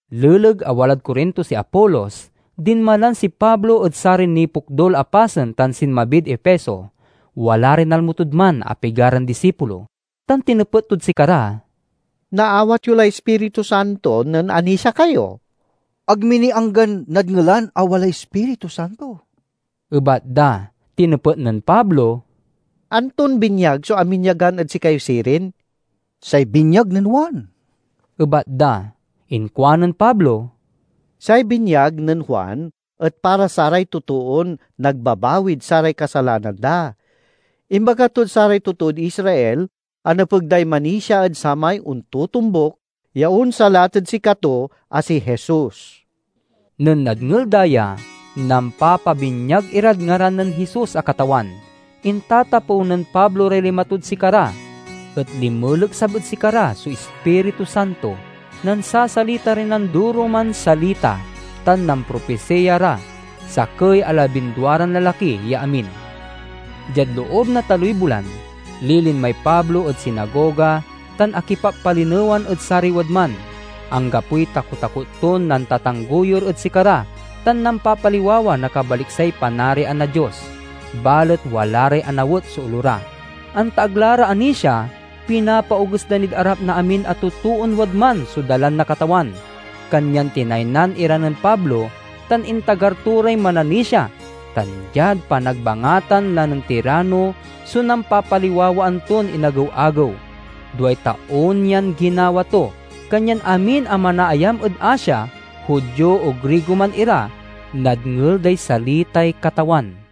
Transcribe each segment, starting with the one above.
Leleg a walad Corinto si Apolos, dinmalan si Pablo ed saray nipokdul a pasen tan sinmabid Efeso. Wala ray nalmo tod man a pigaran disipulo, tan tinepet tod sikara, "Naawat yo lay Ispiritu Santo nen anisia kayo?" "Ag mi ni anggan nadngelan a walay Ispiritu Santo," ebat da. Tinepet nen Pablo, "Anton binyag so aminyagan ed sikayo sirin?" "Say binyag nen Juan," ebat da. Inkuanen Pablo, "Say binyag nen Juan et para saray totoon nagbabawid saray kasalanan da. Imbaga tod saray totood Israel a nepeg day manisia ed samay ontotombuk ya onsalat ed sikato, a si Jesus." Nen nadngel da ya, nampapabinyag irad ngaran nen Jesus a Katawan. Intatapew nen Pablo ray lima to ed sikara, et linmeleksab ed sikara so Ispiritu Santo, nansasalita ray nandoroman salita, tan nampropisiya ra. Sakey a labindua ran lalaki ya amin. Diad loob na taloy bulan, lilinmay Pablo ed sinagoga tan akipappalinewan ed saray wadman. Anggapoy takotakot ton nantatangguyor ed sikara tan nampapaliwawa na kabaliksay Panarian na Dios. Balet wala ray anawet so olo ra. Anta ag la ra anisia, pinapaoges da nid arap na amin a totoon wadman so Dalan na Katawan. Kanyan tinaynan ira nen Pablo tan intagar to ray mananisia, tan diad panagbangatan la nen Tirano so nampapaliwawaan ton inagew-agew. Duay taon yan ginawa to, kanyan amin a manaayam ed Asia, Judio o Grigo man ira, nadngel day salitay Katawan.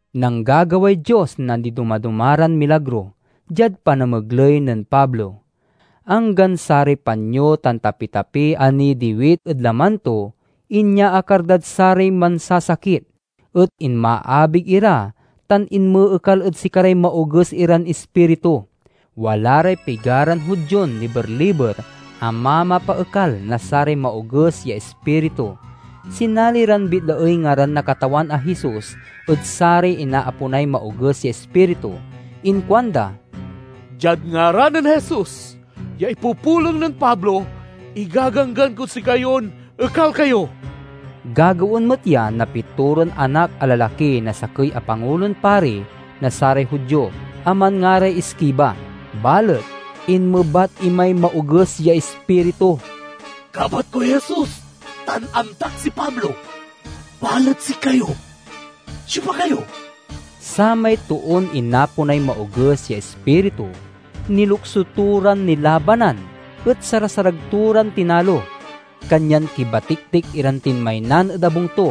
Nanggagaway Dios na nidomadoma ran milagro, diad panamegley nen Pablo. Anggan saray panyo tan tapitapi a nidiwit ed laman to inyaakar dad saray mansasakit, et inmaabig ira tan inmeekal ed sikaray maoges iran ispiritu. Wala ray pigaran Judion liber-liber a mamapaekal na saray maoges ya ispiritu. Sinali ran bitlaey ngaran na Katawan a Jesus ed saray inaaponay maoges ya ispiritu. Inkuanda, "Diad ngaran nen Jesus ya ipupulong nen Pablo, igaganggan kod sikayon ekal kayo." Gagawaen met ya na pitoran anak a lalaki na sakey a Pangulon Pari na saray Judio, a manngaray Esceva. Balet inmebat imay maoges ya ispiritu, "Kabat koy Jesus tan amtak si Pablo, balet sikayo—siopa kayo?" Samay toon inaponay maoges ya ispiritu nilokso to ran nilabanan et sarasarag to ran tinalo. Kanyan kibatiktik iran tinmaynan ed abung to,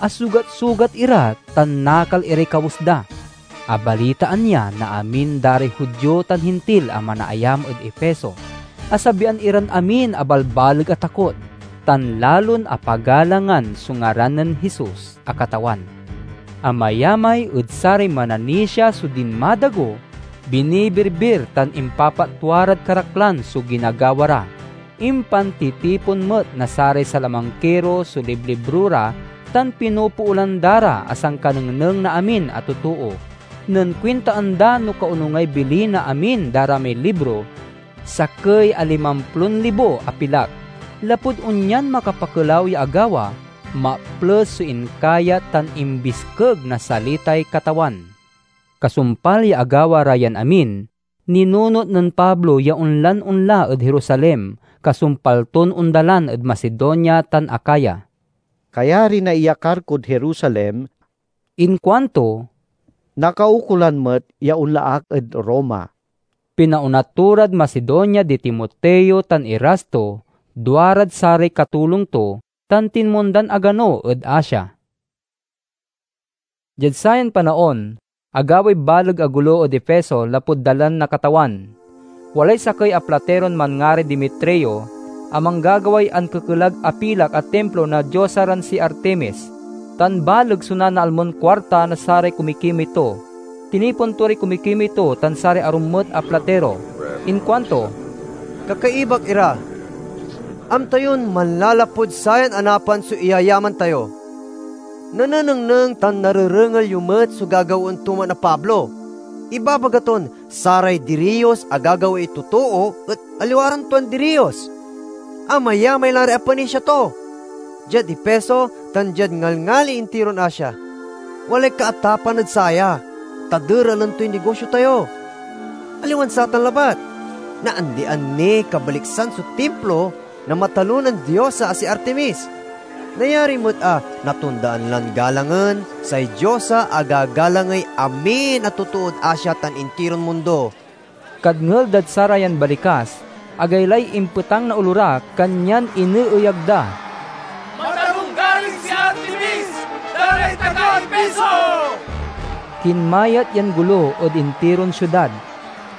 asugatsugat ira, tan nakal iray kawes da. Abalitaan ya na amin da ray Judio tan Hintil a manaayam ed Efeso. Asabian iran amin a balbaleg a takot, tan lalon apagalangan so ngaran nen Jesus a Katawan. Amayamay ed saray mananisia so dinmadago, binibirbir tan impapatwa rad karaklan so ginagawa ra. Impantitipon met na saray salamangkiro so liblibro ra tan pinopoolan da ra a sankanengneng na amin a totoo. Nen kuintaen da no kaonungay bili na amin da ra may libro, sakey a limamplon libo a pilak. Lapud onyan makapakelaw ya agawa, maples so inkayat tan imbiskeg na salitay Katawan. Kasumpal ya agawa ra yan amin, ninunot nen Pablo ya onlan onla ed Jerusalem kasumpal ton ondalan ed Macedonia tan Acaya. "Kayari na iyakar kod Jerusalem," inkuanto, "nakaukolan met ya onla ak ed Roma." Pinaona to rad Macedonia di Timoteo tan Erasto, duarad saray katulong to, tan tinmondan agano ed Asia. Diad sayan panaon agaway baleg a golo ed Efeso lapud Dalan na Katawan. Walay sakey a platiron manngaray Demetrio, a manggagaway ankekelag a pilak a timplo na diosa ran si Artemis, tan baleg so nanaalmon kuarta na saray kumikimey to. Tinipon to ray kumikimey to tan saray arum met a platiro. Inkuanto, "Kakaibak ira, amta yon manlalapud sayan anapan so iyayaman tayo. Nanenengneng tan narerengel yo met so gagawaen to man a Pablo. Ibabaga ton saray diriyos a gagawaey totoo et aliwa ran tuan diriyos. Amayamay la ray apanisia to, diad Efeso tan diad ngalngali intiron Asia. Walay kaatapan ed saya, ta deralen toy nigosio tayo. Aliwan satan labat, naandian niy kabaliksan so timplo na matalonan diosa a si Artemis. Nayari met a natondaan lan galangen, say diosa a gagalangey amin a totood Asia tan intiron mundo!" Kadngel dad sarayan balikas, agaylay impetang na olo ra kanyan ineeyag da, "Matalonggaring si Artemis da ray taga Efeso!" Kinmayat yan golo ed intiron siudad.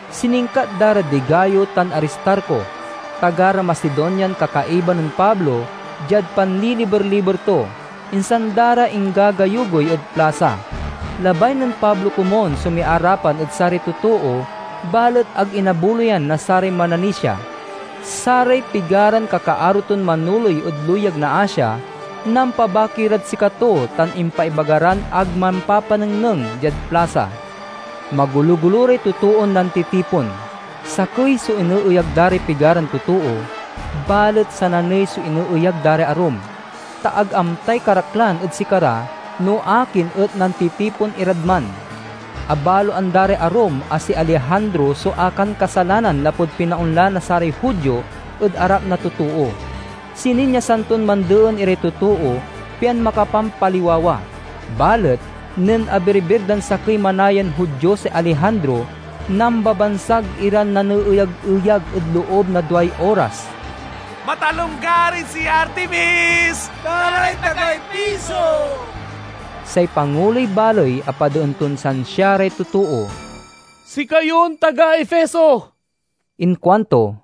Siningkat da ra di Gayo tan Aristarco, taga ra Macedonian kakaiba nen Pablo diad panliliber-liber to, insan da ra inggagayugoy ed plasa. Labay nen Pablo komun so miarapan ed saray totoo, balet ag inabuloyan na saray mananisia. Saray pigaran kakaaro ton manoley ed luyag na Asia nampabaki rad sikato tan impaibaga ran ag mampapanengneng diad plasa. Magologolo ray totoon nantitipon. Sakey so ineeyag da ray pigaran totoo, balet sananey so ineeyag da ray arum, ta ag amtay karaklan ed sikara no akin et nantitipon irad man. Abaloan da ray arum a si Alejandro so akankasalanan lapud pinaonla na saray Judio ed arap na totoo. Sininyasan ton mandeen iray totoo, pian makapampaliwawa. Balet nen abirbir dan sakey manayan Judio si Alejandro, nambabansag iran naneeyageyag ed loob na duay oras, 'Matalonggaring si Artemis da ray taga Efeso!" Say panguloy baley apadeen ton siansia ray totoo. "Sikayon taga Efeso!" inkuanto.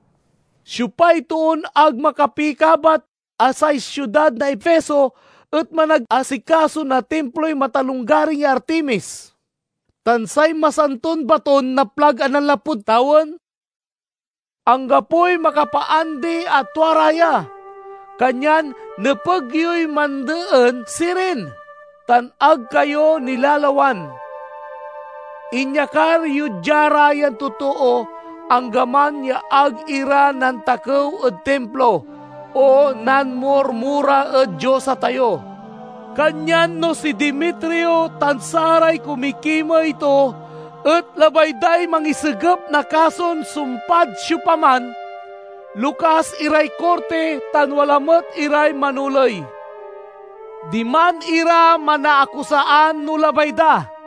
"Siopay toon ag makapikabat a say siudad na Efeso et managasikaso na timploy matalonggaring ya Artemis, tan say masanton baton naplag a nanlapud tawen? Anggapoy makapaandi a tua ra ya. Kanyan nepeg yoy mandeen sirin, tan ag kayo nilalawan. Inyakar yo dia ra yan totoo, anggaman ya ag ira nantakew ed timplo o nanmurmura ed diosa tayo. Kanyan no si Demetrio tan saray kumikimey to et labay day mangisegep na kason sumpad siopaman, lokas iray korti, tan wala met iray manoley. Diman ira manaakusaan no labay da.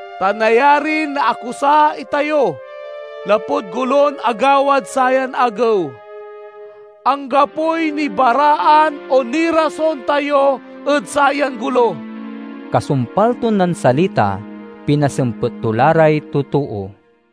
Ta nayarin naakusa itayo, lapud golon agawad sayan agew. Anggapoy nibaraan o nirason tayo ed sayan golo." Kasumpal ton nansalita, pinasempet to la ray totoo.